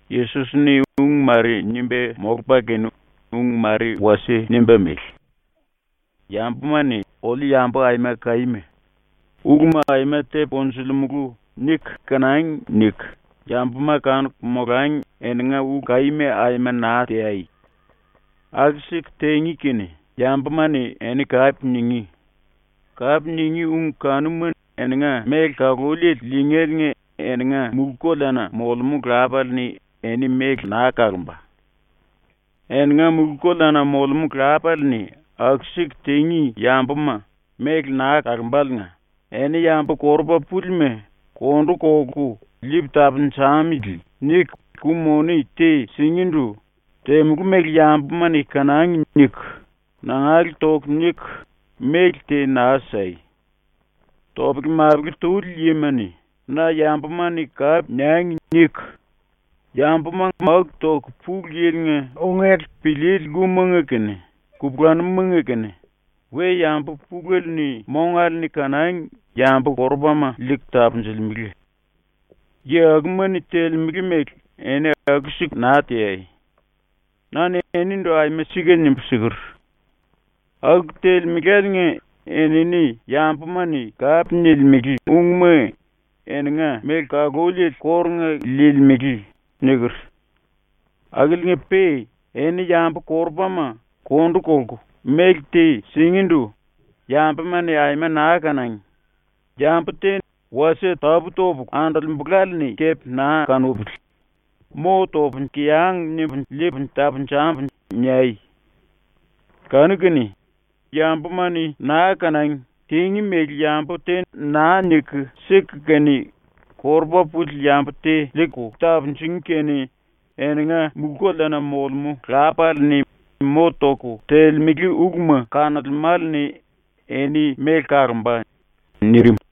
⸤Yesos-ni ung mare nimba molupa kene ung mare wasie nimba mele:⸥ “‘Yambuma-ni ‘Oliu yambu aima kaíma. Uluma aima tepu konjulimulu.’ niku kanangi.’ niku yambuma kanuku molangi eninga ulu kaíma aima naa teai. Aku-siku tingí kene yambuma-ni eni kape ningí. Kape ningí ung kanuma eninga méle kaluliele liingéliinga eninga mulú-koleana molemú Lapale-ni eni méle naa kalomba. “⸤Eninga mulú-koleana molemú Lapale-ni aku-siku tingí yambuma méle naa kalomba⸥liinga eni yambu korupa púlima kondu kolku ‘Liipu tapunjamili.’ niku ku-moni te singíndu ‘Temulú mele yambuma-ni kanangi.’ niku, nangale toku niku méle te naa sai. Topele-mapele tuli yima-ni ‘Na yambuma-ni kape niangi.’ niku yambuma máku toku Pulu Yili-nga ungele piliili lkumanga kene kupulanumumanga kene we-yambu pulele-ni mongale-ni kanangi yambu-korupama liiku tapunjulemele. Yi akuma-ni telemele mele eni aku-siku naa teai. Na-ni enindu aima sika nimbu siker: “Aku telemeláliinga enini yambuma-ni kape nilimele ungma eninga méle kaluliele kórunga liilimele.” niker. “Akiliinga-pe eni yambu-korupama kondu kolku méle te singíndu ‘Yambuma-ni aima naa kanangi. Yambu te wasie tapú-topulu andolembulále-ni kepe naa kanupili, mo topu kiyang nimbu liipu tapunjambu.’ niai. Kanu-kene yambuma-ni naa kanangi, tingí mele yambu te naa niku siku kene korupa puli yambu te liiku tapunjungí kene eninga ⸤mulú-koleana molemú⸥ Lapale-ni mo toku telemele uluma kanolemále-ni eni méle kalomba.” ⸤nirim.⸥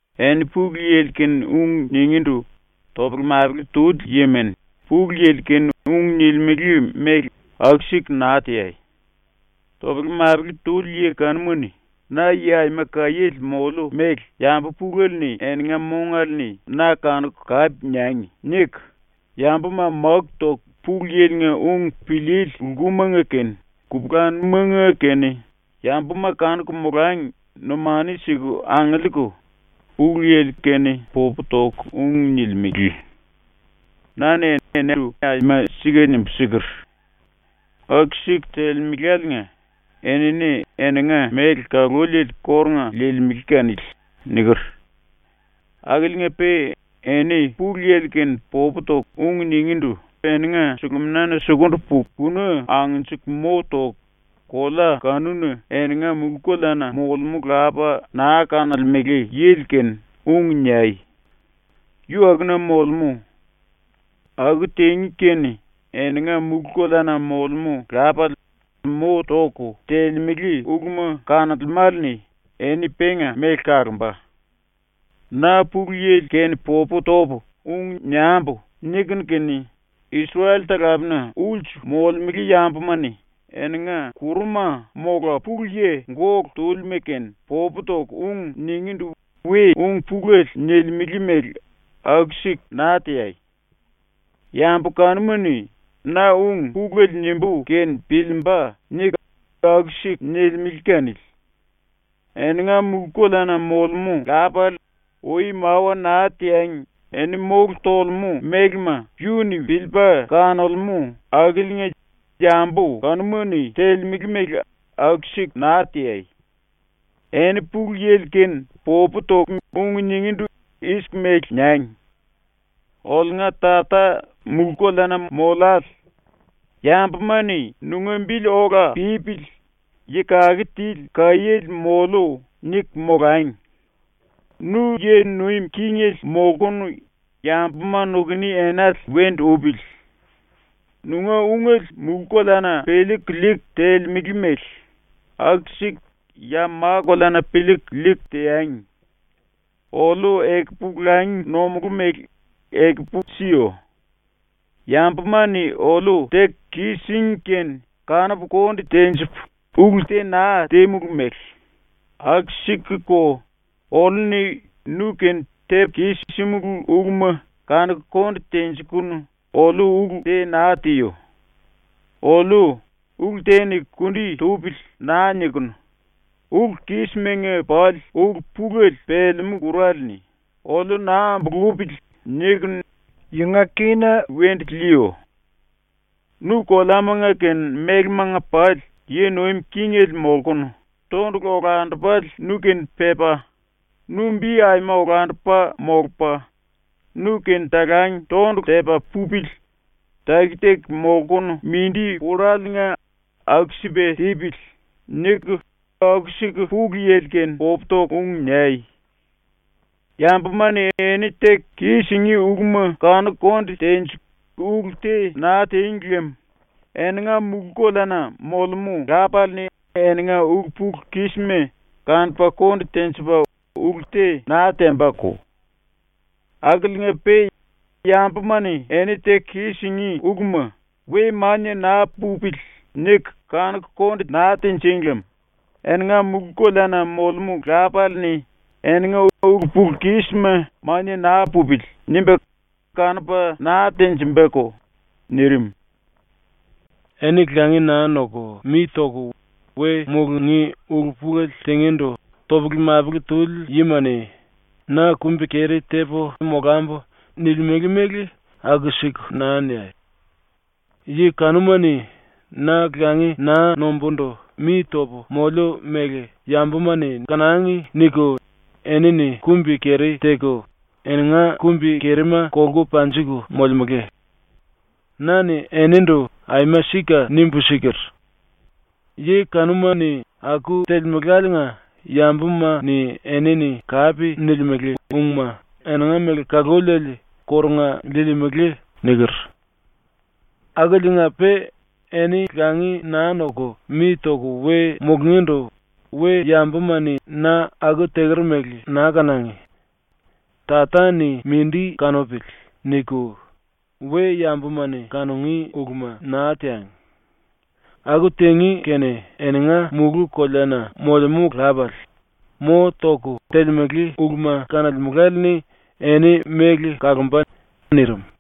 “Eni Pulu Yili kene ung ningíndu topele-mapele tuli yima-ni Pulu Yili kene ung nilimele mele aku-siku naa teai. Topele-mapele tuli yi kanuma-ni ‘Na yi aima kaiéle moliu mele yambu pulele-ni eninga mongale-ni na kanuku kape niangi.’ niku yambuma máku toku Pulu Yili-nga ung piliili lkumanga kene kupulanumumanga kene yambuma kanuku molangi numanu siku angiliiku Pulu Yili-popu kene ung toku nilimele. Na-ni enindu aima sika nimbu siker: “Aku-siku telemeláliinga enini eninga méle kaluliele kórunga liilimele kanili.” niker. Akiliinga-pe eni Pulu Yili-kene popu toku ung ningíndu eninga suluminana sukundu puku kuna angnjiku mo toku kolea kanuna eninga ⸤mulú-koleana molemú⸥ Lapa naa kanolemele yili-kene ung niai. ⸤Yu akuna molemú.⸥ Aku tingí kene eninga ⸤mulú-koleana molemú⸥ Lapale mo toku telemele uluma kanolemále-ni eni penga méle kalomba. “‘Na Pulu Yili-kene popu topu ung niambu.’ nikunu kene Isrel-talapena ulsu molemele yambuma-ni eninga kuruma mola pulu yi gólu túlima-kene popu toku ung ningíndu we ung pulele nilimele mele aku-siku naa teai. Yambu kanuma-ni ‘Na ung pulele nimbú kene piliimba.’ niku aku-siku nilimele kanili. Eninga ⸤mulú-koleana molemú⸥ Lapale ui mawa naa teangi eni mólu tolemú mélema yu-ni piliipa kanolemú akiliinga yambu kanuma-ni telemele mele aku-siku naa teai. “Eni Pulu Yili kene popu toku ung ningíndu i-siku mele niangi: “Oliunga Tata mulú-koleana mollale, yambuma-ni ‘Nunga bili ola pípili yi kake tili kaiéle mollu.’ niku molangi. Nu yi nuim kingele molkunu yambuma nukuni enale wendu upili. Nunga ungele mulú-koleana piliiku liiku telemele mele aku-siku ya ma-koleana piliiku liiku teangi. Oliu ekupu langi nomulú mele ekupu siyo. Yambuma-ni oliu teku kis-síngi kene kanupu konde tenjipu ulu te naa tímulu mele aku-sikuko oliu-ni nu-kene tepu kis-símulu uluma kanuku konde tenjikunu oliu ulu te naa tiyo. Oliu ‘Ulu te-ni kundi tupili.’ naa nikunu ulu-kismanga pali ulu-pulele pelemú ⸤kur⸥ale-ni ‘oliu naa ambulupili.’ nikunu yunga kína wendu liiyo. (Nu koleama kene mélemanga pali yi nuim kingele molkunu, tondulu olandupale nu-kene pepa, nu bi aima olandupa molupa nu-kene talang tondulu-tepa pupili taki-taki molkunu mindi pullaliinga aku-sipa tipili.)” niku aku-siku Pulu Yili-kene popu toku ung niai. “Yambuma-ni eni teku kis-singí uluma kanuku konde tenjiku ulu te naa tíng lem eninga mulú-koleana molemú Lapale-ni eninga ulu-pulu-kísima kanupa konde tenjipa ulu te naa tembako. Akiliinga-pe yambuma-ni eni teku kis-singí uluma ‘We mania naa pupili.’ niku kanuku konde naa tinjíng lem eninga ⸤mulú-koleana molemú⸥ Lapale-ni eninga ulu-pulu-kísima ‘Mania naa pupili.’ nimba kanupa naa tenjimbako.” ⸤nirim.⸥ “Eni langi naa noku mi toku we mulungí ulu-pulele tingíndu topele-mapele tuli yima-ni ‘Na kumbi-keri tepu molambu.’ nilimele mele aku-siku naa niai. Yi kanuma-ni ‘Na langi naa nombúndu mi topu moliu mele yambuma-ni kanangi.’ niku enini kumbi-keri teku eninga kumbi-kerima kolku panjiku molemele. Na-ni enindu aima sika nimbu siker: “Yi kanuma-ni aku telemeláliinga yambuma-ni enini kape nilimele ungma eninga méle kaluliele kórunga liilimele.” niker. “Akiliinga-pe eni langi naa noku mi toku we mulungíndu ‘We-yambuma-ni na aku teker mele naa kanangi. Tata-ni mindi kanupili.’ niku we-yambuma-ni kanungí uluma naa teangi. Aku tingí kene eninga ⸤mulú-koleana molemú⸥ Lapale mo toku telemele uluma kanolemále-ni eni méle kalomba.” ⸤nirim.⸥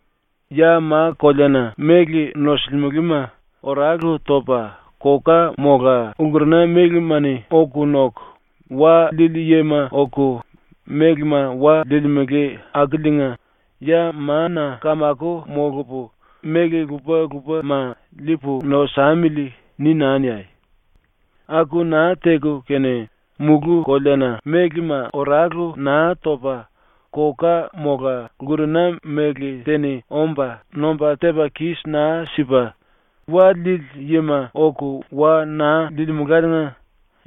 “Ya ma-koleana méle nosulimelema oralu topa koka mola lkurena mélema-ni oku noku, wa liili yima oku mélema wa liilimele akiliinga ⸤ya mana⸥ kamako molupu méle lupa-lupama liipu nosamili.’ ni naa niai. Aku naa teku kene mulú-koleana mélema oralu naa topa koka mola lkurena méle te-ni omba nomba tepa kis naa sipa, wa liili yima oku wa naa liilimeláliinga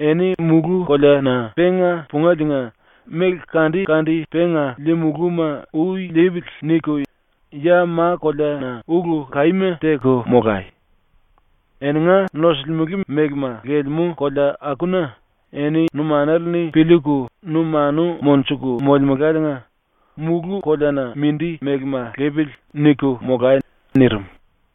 eni mulú-koleana ⸤penga pungéliinga⸥ ‘méle kande-kande penga liimulúma ui lipili.’ niku ya ma-koleana ulu kaíma teku molai. Eninga nosulimele mélema lelemú kolea akuna eni numanale-ni piliiku numanu monjuku molemeláliinga ⸤‘mulú-koleana mindi mélema lipili.’ niku molai.” nirim⸥.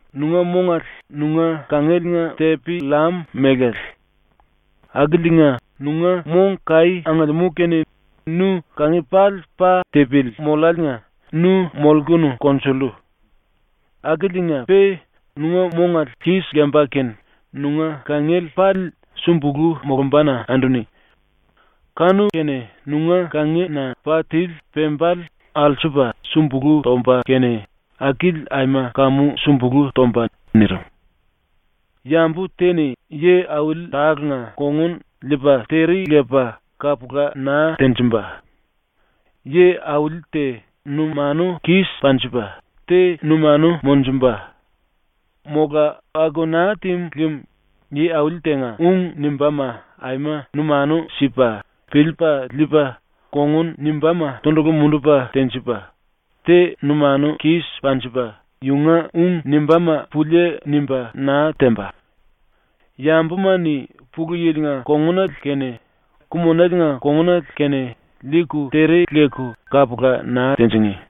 “Nunga mongale nunga kangieliinga tepi-llam mélale. Akiliinga nunga mong kaí angiliimú kene nu kangi pali pa tipili molláliinga nu molkunu konjullu. Akiliinga-pe nunga mongale kis lemba kene nunga kangiele pali sumbulú molombana anduni. Kanu-kene nunga kangina pa tili pembale alsupa sumbulú tomba kene akili aima kamu sumbulú tomba.” ⸤nirim.⸥ “Yambu te-ni yi-auli tálenga kongun liipa tere lepa kapula naa tenjimba. Yi-auli te numanu kis panjipa, te numanu monjumba. Mola aku naa tímu lem yi auli tenga ung nimbáma aima numanu sipa piliipa liipa kongun nimbáma tondulu mundupa tenjipa, te numanu kis panjipa yunga ung nimbáma pulie nimba naa temba. Yambuma-ni Pulu Yili-nga kongunale kene Ku-Monelenga kongunale kene liiku tere leku kapula naa tinjingí.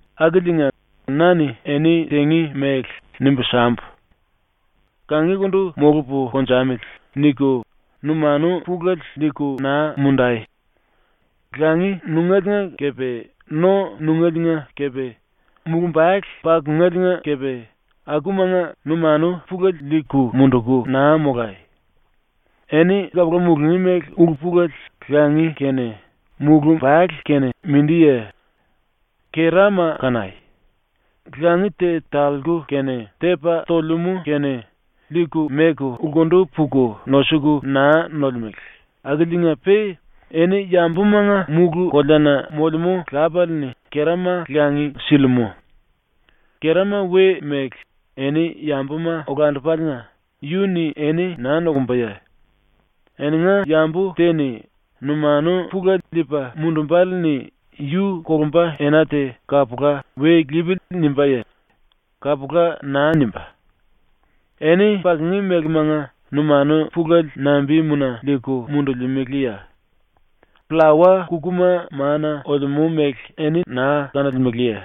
“Akiliinga na-ni eni ⸤tingí mele⸥ nimbu sambu. ‘Kangikundu molupu konjamili.’ niku numanu pulele liiku naa mundai. Langi nungéliinga kepe no nungéliinga kepe mulumbale pakungéliinga kepe akumanga numanu pulele liiku munduku naa molai. Eni kapula mulungí mele ulu-pulele langi kene mulumbale kene mindiye? Kerama kanai. Langi te talku kene tepa tolemú kene liiku meku lkundu puku nosuku naa nolemele akiliinga-pe eni yambumanga mulú-koleana molemú Lapale-ni kerama langi silimú. Kerama we-mele, eni yambuma olandupaliinga yu-ni eni naa nokumbaye? Eninga yambu te-ni numanu pulele liipa mundumbále-ni yu kolumba ena te kapula ‘We lipili.’ nimbáye? Kapula naa nimbá. “Eni pakungí mélemanga numanu pulele nambimuna liiku mundulimeleye? Pllawa-kukuma mana olemú mele eni naa kanolemeleye?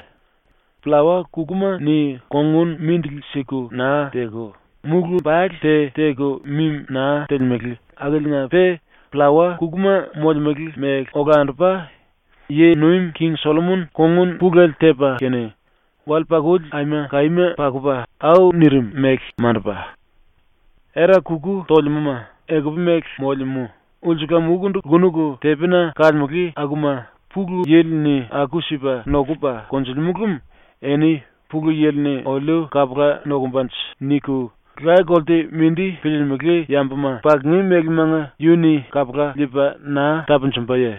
Pllawa-kukuma-ni kongun mindili siku naa teku, mulumbale te teku mimi naa telemele akiliinga-pe pllawa-kukuma molemele mele olandupa, ⸤yi nuim king⸥ Sollomon kongun pulele tepa kene wale-pakuli aima kaíma pakupa au nirim mele mandupa. Era-kuku tolemúma ekupu-mele molemú, ulsulam-ukundu ⸤lkunuku⸥ tepina kalemele akuma Pulu Yili-ni aku-sipa nokupa konjulimú lem eni ‘Pulu Yili-ni oliu kapula nokumbanje.’ niku laye-kolte mindi piliilimili yambuma pakungí mélemanga yu-ni kapula liipa naa tapunjumbaye?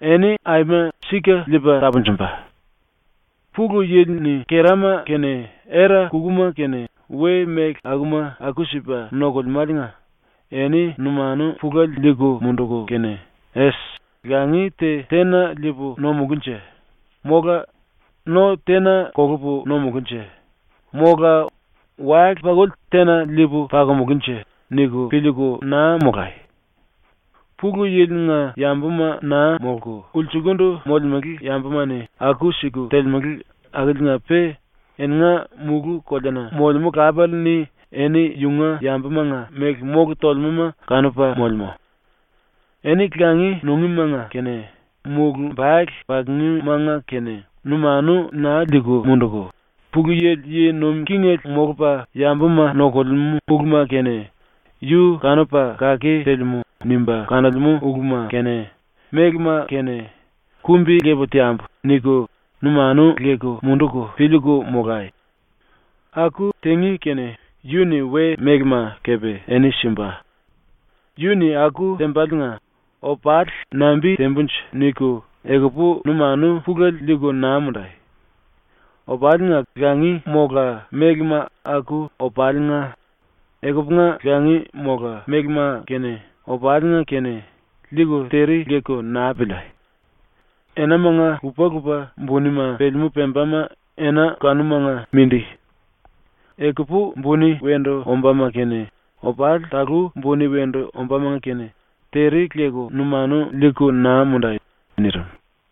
Eni aima sika liipa tapunjumba. “⸤Pulu Yili-ni kerama kene era-kukuma kene we-méle akuma aku-sipa nokulem⸥áliinga eni numanu pulele liiku munduku kene ‘Es, langi te tena liipu nomulúnje?’, mola ‘No tena kolupu nomulúnje?’, mola ‘Wale-pakuli tena liipu pakomulúnje?’ niku piliiku naa molai. Pulu Yili-nga yambuma naa molku ulsukundu molemele yambuma-ni aku-siku telemele akiliinga-pe eninga mulú-koleana molemú Lapale-ni eni yunga yambumanga méle mólu tolemúma kanupa molemú. ⸤Eni langi nungímanga kene mulumbale pakungímanga kene numanu naa liiku munduku,⸥ Pulu Yili yi nuim kingele molupa yambuma nokulemú uluma kene yu kanupa kake telemú nimba kanolemú uluma kene mélema kene ‘Kumbi-lepu teambu.’ niku numanu liiku munduku piliiku molai. Aku tingí kene yu-ni we-mélema kepe eni simba. Yu-ni aku tembaliinga ‘Opali nambi tembunje?’ niku ekupu numanu pulele liiku naa mundai. Opalinga langi mola mélema aku opalinga, ekupunga langi mola mélema kene, opalinga kene, liiku tere leku naa piliai! Enamanga lupa-lupa bunima pelemú pembama ena kanumanga mindi. Ekupu buni wendu ombáma kene, opali talú buni wendu ombámanga kene tere leku numanu liiku naa mundai.” ⸤nirim.⸥